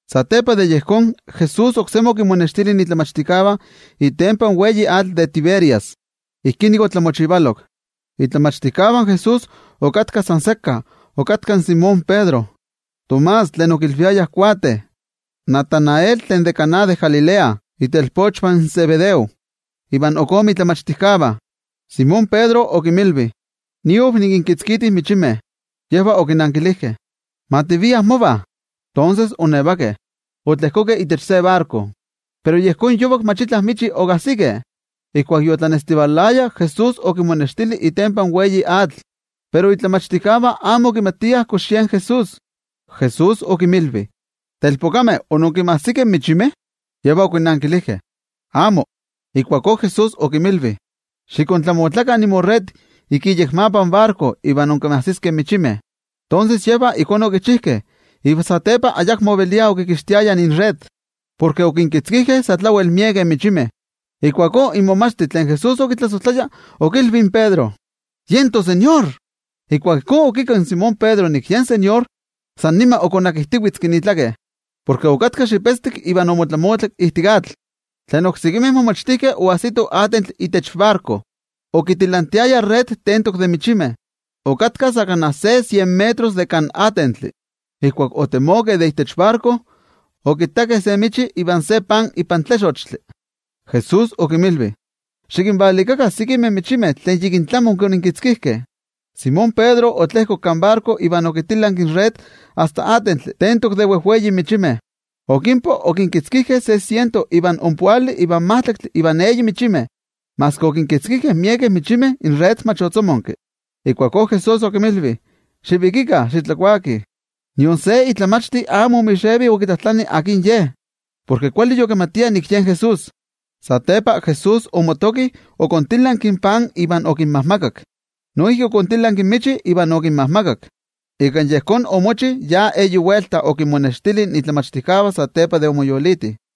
Satepa de yejón, Jesús oksemi okinmonextili in momachtijkeh itempan atl tlen wei de Tiberias. Ijkí nik opanolok: In momachtijkeh okatkah san sekka, okatka in Simón Pedro, Tomás tlen okilviayah Nenetl, Natanael tlen de Caná de Galilea, itelpochvah in Zebedeo iva ok ome momachtijkeh. Simón Pedro okinmilvi: —Niav nikinkitzkiti michimeh. Yejvah okinankilijkeh: —Ma tiviah mova. Tonses oonnevakeh, otlejkokeh itech se barko. Pero yejón yovak mach itla michi okajsikeh. Ijkuak yotlanestivalaya, Jesús okinmonextili itempan atl tlen wei, pero in momachtijkeh amo okimatiah kox yen Jesús. Jesús okinmilvi: —Telpokameh, ¿onkinmajsikeh michimeh? Yejvah okinankilijkeh: —Amo. Ijkuakó Jesús okinmilvi: —Xikontlamotlakah inmored ik iyekmapa in barko iva inkinmajsiskeh michimeh. Tonses, yejvah ijkó okichijkeh, iva satepa ayakmo oveliah okikixtiayah inred, porke okinkitzkijkeh sa tlawel miekeh michimeh. Ijkuakó in momachti tlen Jesús okitlasojtlaya okilvi in Pedro: —¡Yen toTeko! Ijkuak ijkó okikakki in Simón Pedro nik yen inTeko, san nima okonakijtivetzki itzotzol, porke okatka xipetztik iva omotlamotlak ijtik atl. Tlen oksekimeh momachtijkeh oajsitoh atentli itech barko, okitilantiayah in red tentok de michimeh. Okatka sa kana se sien metros de kan atentli. Ijkuak otemokeh de itech barko, okittakeh se michi iva se pan ipan tlixochtli. Jesús okinmilvi: —Xikinvalikakah sekimeh michimeh tlen yikin onkoninkitzkijkeh. Simón Pedro otlejkok kan barko iva okitilanki in red asta atentli tentok de wejwei michimeh. Okinpoh, okinkitzkijkeh se siento ivan ompoali ivan majtlaktli ivan eyi michimeh. Maski okinkitzkijkeh miekeh michimeh, in red mach otzomonki. Ijkuakó Jesús okinmilvi: —Xivikikah xitlakuakih. Nion se momachti amo omixevi okitlajtlani akin Ye, porke kuali yokimatiah nik yen Jesús. Satepa Jesús omotoki, okontilanki in pan iva okinmajmakak. Noijki okontilanki in michi iva okinmajmakak. Ika yejón omochi ya eyi welta okinmonextili in momachtijkeh satepa de omoyoliti.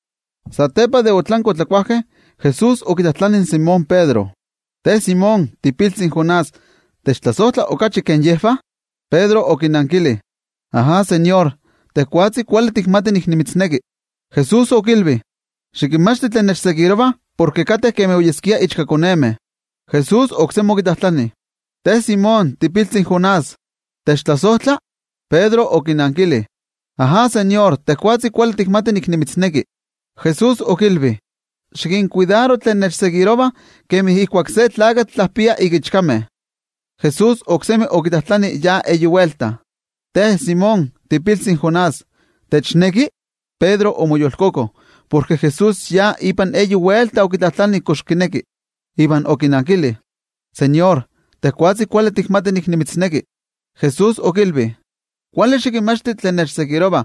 Satepa de otlankeh otlakuajkeh, Jesús okitlajtlani in Simón Pedro: —Te Simón, tiipiltzi in Jonás, ¿techtlasojtla okachi ke yejvah? Pedro okinankili: —Ajá, noTeko, tejwatzi kuali tikmati nik nimitzneki. Jesús okilvi: —Xikintlamaka tlen nechseguirovah, porke kateh kemi nochkakonevah. Jesús oksemi okitlajtlani: —Te Simón, tiipiltzi in Jonás, ¿techtlasojtla? Pedro okinankili: —Ajá, noTeko, tejwatzi kuali tikmati nik nimitzneki. Jesús okilvi: —Xikinkuidaro tlen nechseguirovah, porke kateh kemi nochkavah. Jesús oksemi okitlajtlani ya eyi welta: —Te Simón, tiipiltzi in Jonás, ¿techneki? Pedro omoyolkoko porke Jesús ya ipan eyi welta okitlajtlani kox kineki. Iva okinankili: —NoTeko, tejwatzi kuali tikmati nik ne nimitzneki. Jesús okilvi: —Xikintlamaka tlen nechseguirovah,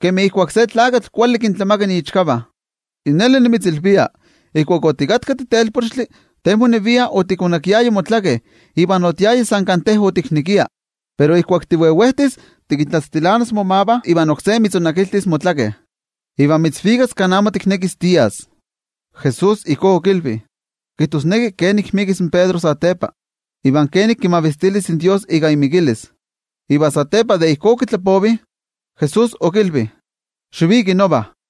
porke kateh kemi nochkavah. Yi neli nimitzilvia, ijkuak otikatka titelpochtli, te monevia otikonakiaya motzotzol iva otiaya san kan te otiknekia. Pero ijkuak tivevejtis, tikintlatztilanas momavah iva oksé mitzonakiltis motzotzol, iva mitzvikas kan amo tiknekis tias. Jesús ijkó okilvi, kijtosneki kenik ixpolivis in Pedro satepa, iva kenik kimavistilis in Dios ika imikilis. Iva satepa de ijkó okitlapovi, Jesús okilvi: —Xiviki nova.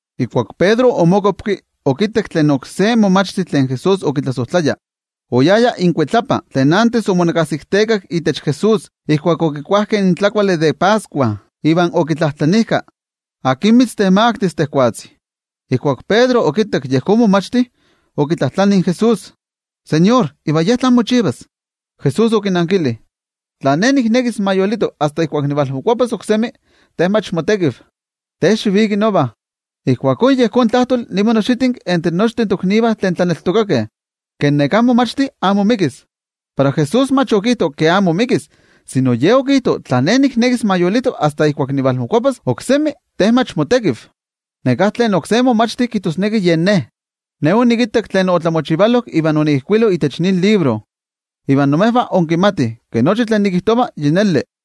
Ijkuak Pedro omokuapki, okittak tlen oksé momachti tlen Jesús okitlasojtlaya, oyaya inkuitlapa, tlen achto omonakasiktekak itech Jesús ijkuak okikuajkeh in tlakuali de Pascua, iva okitlajtlanijka: “¿Akin mitztemaktis tejwatzi?” Ijkuak Pedro okittak yejón momachti, okitlajtlani in Jesús: —NoTeko, ¿iva ye tlán mochivas? Jesús okinankili: —Tla Ne niknekis ma yolito asta ijkuak nivalmokuapas oksemi, te mach motekiv. Te xiviki nova. Ijkuakó yejón tlajtoli niman oxitinki itech nochtin toknivah tlaneltokakeh, ke neká momachti amo ixpolivis. Pero Jesús mach okijto ke amo ixpolivis, sino Ye okijto: “Tla Ne niknekis ma yolito asta ijkuak nivalmokuapas oksemi, te mach motekiv.” Neká tlen oksé momachti kijtosneki yen ne. Ne onikittak tlen opanolok iva onikijkuilo itech nin libro. Iva imejvah inkimatih ke nochi tlen nikijtova, yi neli.